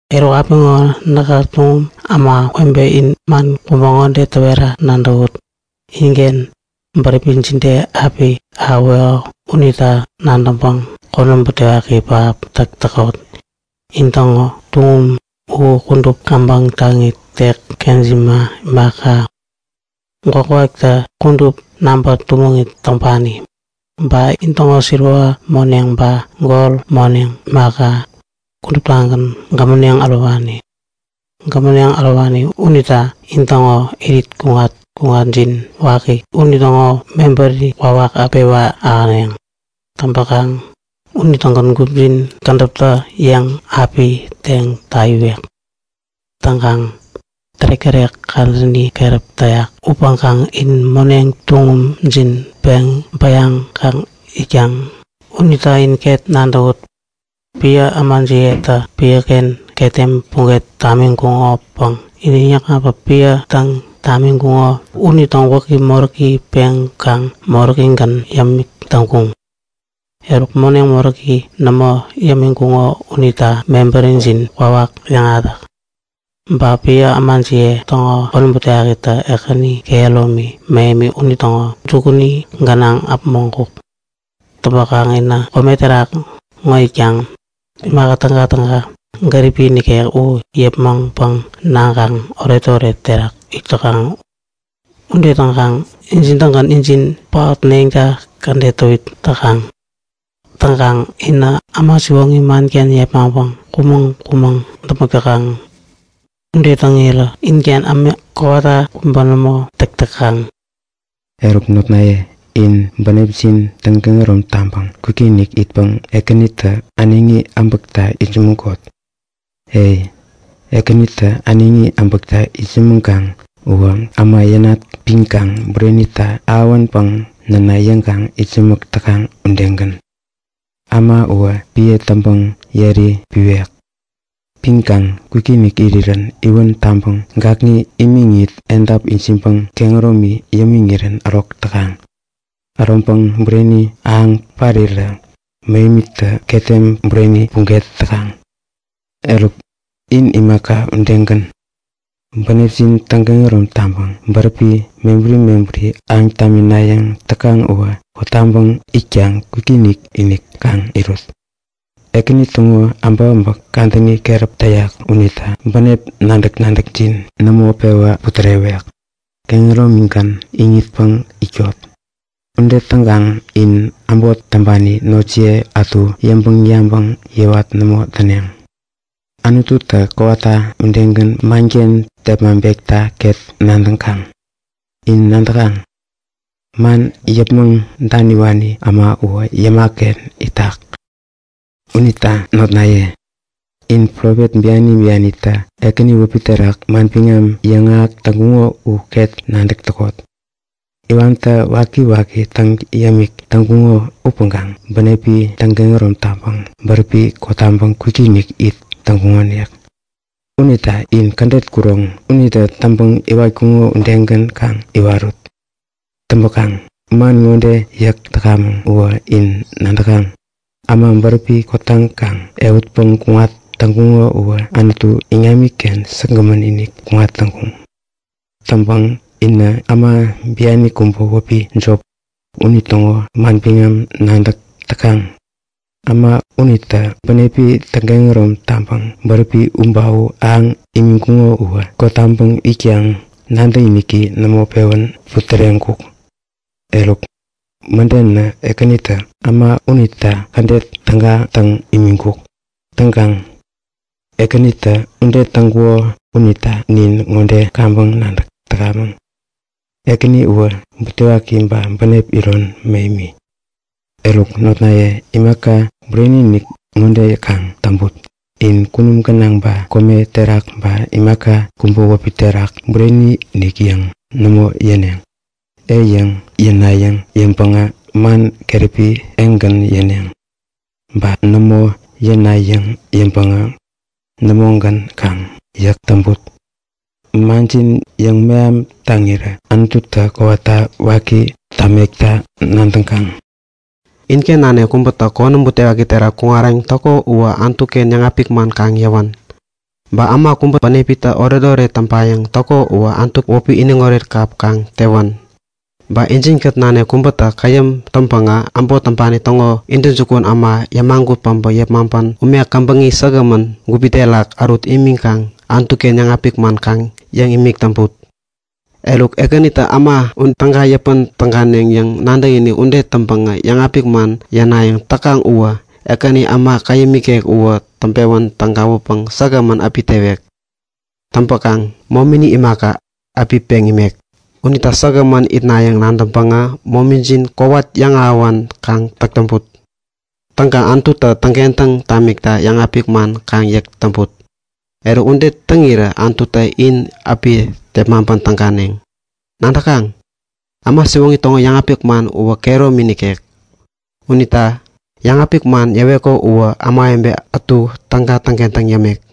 Eruk, apiŋo näkä tuŋum ämawebe in man kubä ŋode täwera nadäwut. Inken bäräpi jide api ahäweko unita nadäŋpäŋ konäm butewaki pähap täk täkot. In-täŋo tuŋum u kudup käbäŋ taŋit, tek kejima imaka, gwakgwaktä kudup naŋpä tumäŋit täŋpani. Ba intäŋo siliwa moneŋ ba gol moneŋ imaka, kuduptagän gämäneŋ ärowani. Gämäneŋ äroŋkuŋo unitä intäŋo irit kuŋat-kuŋatjin waki unitäŋo mebäri kwawak api pewän ahäneŋ. Täŋpäkaŋ unitägän gupjin kädäptä-yäŋ api teŋ täyiwek. Täŋkaŋ tärek-tärek kadäni keräpi täyak upäŋkaŋ in moneŋ tuŋumjin pen butuŋpäŋ peŋ bäyaŋkaŋ itkaŋ. Unita in ket nadäwut! Piä ämajiyetä piäken ketem puget tamiŋkuŋopäŋ inä täŋyäkŋatpäŋ piä täŋ tamiŋkuŋo unitäŋo gwäki moräki peŋkaŋ moräkigän yämik täŋkuŋ. Eruk, moneŋ moräki nämo yämiŋkuŋo unitä mebärijin kwawak yäŋahätak! Ba piä ämajiye täŋo konäm butewakitä Ekäni kehäromi mähemi unitäŋo jukuni gänaŋ äpmoŋkuk. Täŋpäkaŋ inä kome terak ŋo itkaŋ imaka tägatäga gäripi nikek u yäpmäŋpäŋ naŋkaŋ oretoret terak it täkaŋ. Ude täŋkaŋ injin-tägän injin paotneŋta kädet täwit täkaŋ. Täŋpäkaŋ inä äma siwoŋi manken yepmaŋpäŋ kumäŋ-kumäŋ däpmäk täkaŋ. Ude täŋirä inken ämik kowata kubä nämo täk täkaŋ. Unita, notnaye, in bänepjin täŋkehärom taŋpäŋ kwikinik itpäŋ Ekänitä äneŋi äbäkta itsämäŋkot. E, Ekänitä äneŋi äbäkta itsämäŋkaŋ uwä äma yänat piŋkaŋ burenitä ahäwäpäŋ näna yäŋkaŋ itsämäk täkaŋ udegän. Äma uwä piä täŋpäŋ yeri piwek. Piŋkaŋ kwikinik irirän iwän taŋpäŋ gakŋi yämiŋit, edap ijiŋpäŋ kehäromi yämiŋirän ärok täkaŋ. Äroŋpäŋ bureni ahäŋpäŋ parirä mähemitä ketem bureni puget täkaŋ. Eruk, in imaka udegän, bänepjin täŋkehärom taŋpäŋ bäräpi mebäri mebäri ahäŋ taminayäŋ täkaŋ uwä kotaŋpäŋ itkaŋ kwikinik-inik kaŋ irut. Ekäni täŋo äbäkäbäk kadäni keräp täyak unita bänep nadäk-nadäkjin nämo pewä putärewek. Kehäromigän iŋitpäŋ itkot. Ude täŋkaŋ in äbot täŋpani notjiye ätu yäŋpäŋ-yabäŋ yäwat nämo täneŋ. Anututä kowata udegän manken tepmaŋpekta ket nadäŋkaŋ. In nadäkaŋ? Man yäpmäŋ daniwani äma uwä yäma-ken itak. Unita notnaye, in profet biani bianitä Ekäni wäpi terak manbiŋam yäŋahäk täŋkuŋo u ket nadäk täkot. Iwantä wakiwaki täŋ yämik täŋkuŋo upäŋkaŋ bänepi täŋkehärom taŋpäŋ bäräpi kotaŋkaŋ kwikinik it täŋkuŋonik. Unita in kädet kuroŋ unitä täŋpäŋ iwatkuŋo udegän kaŋ iwarut. Täŋpäkaŋ man ŋode yäk täkamäŋ uwä in nadäkaŋ; Äma bäräpi kotaŋkaŋ ehutpäŋ kuŋat täŋkuŋo uwä Anutu iŋamiken säkgämän-inik kuŋatkuŋ. Täŋpäkaŋ inä äma biani kubä wäpi Jop, unitäŋo manbiŋam nadäk täkaŋ. Äma unitä bänepi täŋkehärom taŋpäŋ bäräpi u ba u ahäŋ imiŋkuŋo uwä kotaŋpäŋ itkaŋ nadäkiniki nämo pewän putäreŋkuk. Eruk mädenä Ekänitä äma unita kädet täga täŋ imiŋkuk. Täŋkaŋ Ekänitä ude täŋkuko unita nin ŋode kaŋpäŋ nadäk täkamäŋ; Ekäni uwä butewaki ba bänep iron mähemi. Eruk notnaye, imaka bureni-inik ŋode kaŋ täŋput; In kunum gänaŋ ba kome terak ba imaka kubä wäpi terak bureni-inik yäŋ nämo yäneŋ. “Ei” yäŋ yänayäŋ yäŋpäŋä man keräpi “Ei”-gän yäneŋ. Ba “nämo” yäŋ yänayäŋ yäŋpäŋä, “Nämo”-gän kaŋ yäk täŋput. Manjin yäŋmeham taŋirä Anututä kowata waki tamekta nadäŋkaŋ. Inken nanik kubätä konäm butewaki terak kuŋarayäŋ täko uwä Anutu-ken yäŋapik man kaŋ yäwän. Ba äma kubä bänepitä oretoret täŋpayäŋ täko uwä Anutu wäpi iniŋoret kap kaŋ tewän. Ba injin-kät nanik kubätä käyäm täŋpänä äbot täŋpani täŋo intäjukun äma yämagut päbä yepmaŋpän ume käbäŋi säkgämän gupi terak ärut imiŋkaŋ Anutu-ken yäŋapik man kaŋ yäŋ imik täŋput. Eruk, Ekänitä äma u täga yäpän täganeŋ yäŋ nadäkinik ude täŋpäŋä yäŋapik man yänayäŋ täkaŋ uwä, Ekänitä äma käyäm ikek uwä täŋpewän tägawäpäŋ säkgämän api tewek. Täŋkaŋ momini imaka, api peŋ imek. Unita säkgämän itnayäŋ nadäŋpäŋä momijin kowat yäŋahäwän kaŋ täk täŋput. Täŋkaŋ Anututä täŋkentäŋ tamikta yäŋapik man kaŋ yäk täŋput. Eruk ude täŋirä Anututä in api tepmaŋpän täganeŋ. Nadäkaŋ? Äma siwoŋi täŋo yäŋapik man uwä kehäromi nikek. Unitä yäŋapik man yäweko uwä ämawebe ätu täga täŋkentäŋ yämek.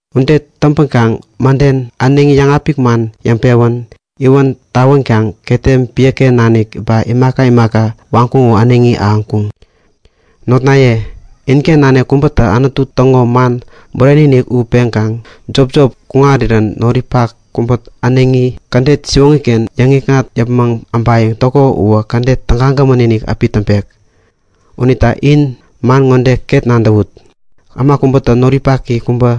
Ude täŋpänkaŋ mäden äneŋi yäŋapik man yäŋpewän, iwäntä tawänkaŋ ketem piäken nanik ba imaka imaka waŋkuŋo u äneŋi ahäŋkuŋ. Notnaye, inken nanik kubätä Anutu täŋo man bureni-inik u peŋkaŋ jopjop kuŋarirän noripak kubätä äneŋi kädet siwoŋi-ken yäŋikŋat yäpmäŋ äbayäŋ täko uwä kädet tägagämän-inik api täŋpek. Unita in man ŋo ket nadäwut; Äma kubätä noripaki kubä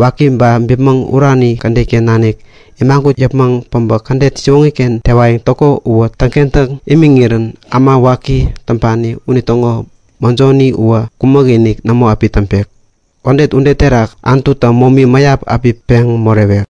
waki ba bipmäŋ urani kädet-ken nanik imagut yäpmäŋ päbä kädet siwoŋi-ken tewayäŋ täko uwä täŋkentäŋ imiŋirän äma waki täŋpani unitäŋo mäjoni uwä kumäk-inik nämo api täŋpek. Täŋpäkaŋ kädet ude terak Anututä momi mäyap api peŋ morewek.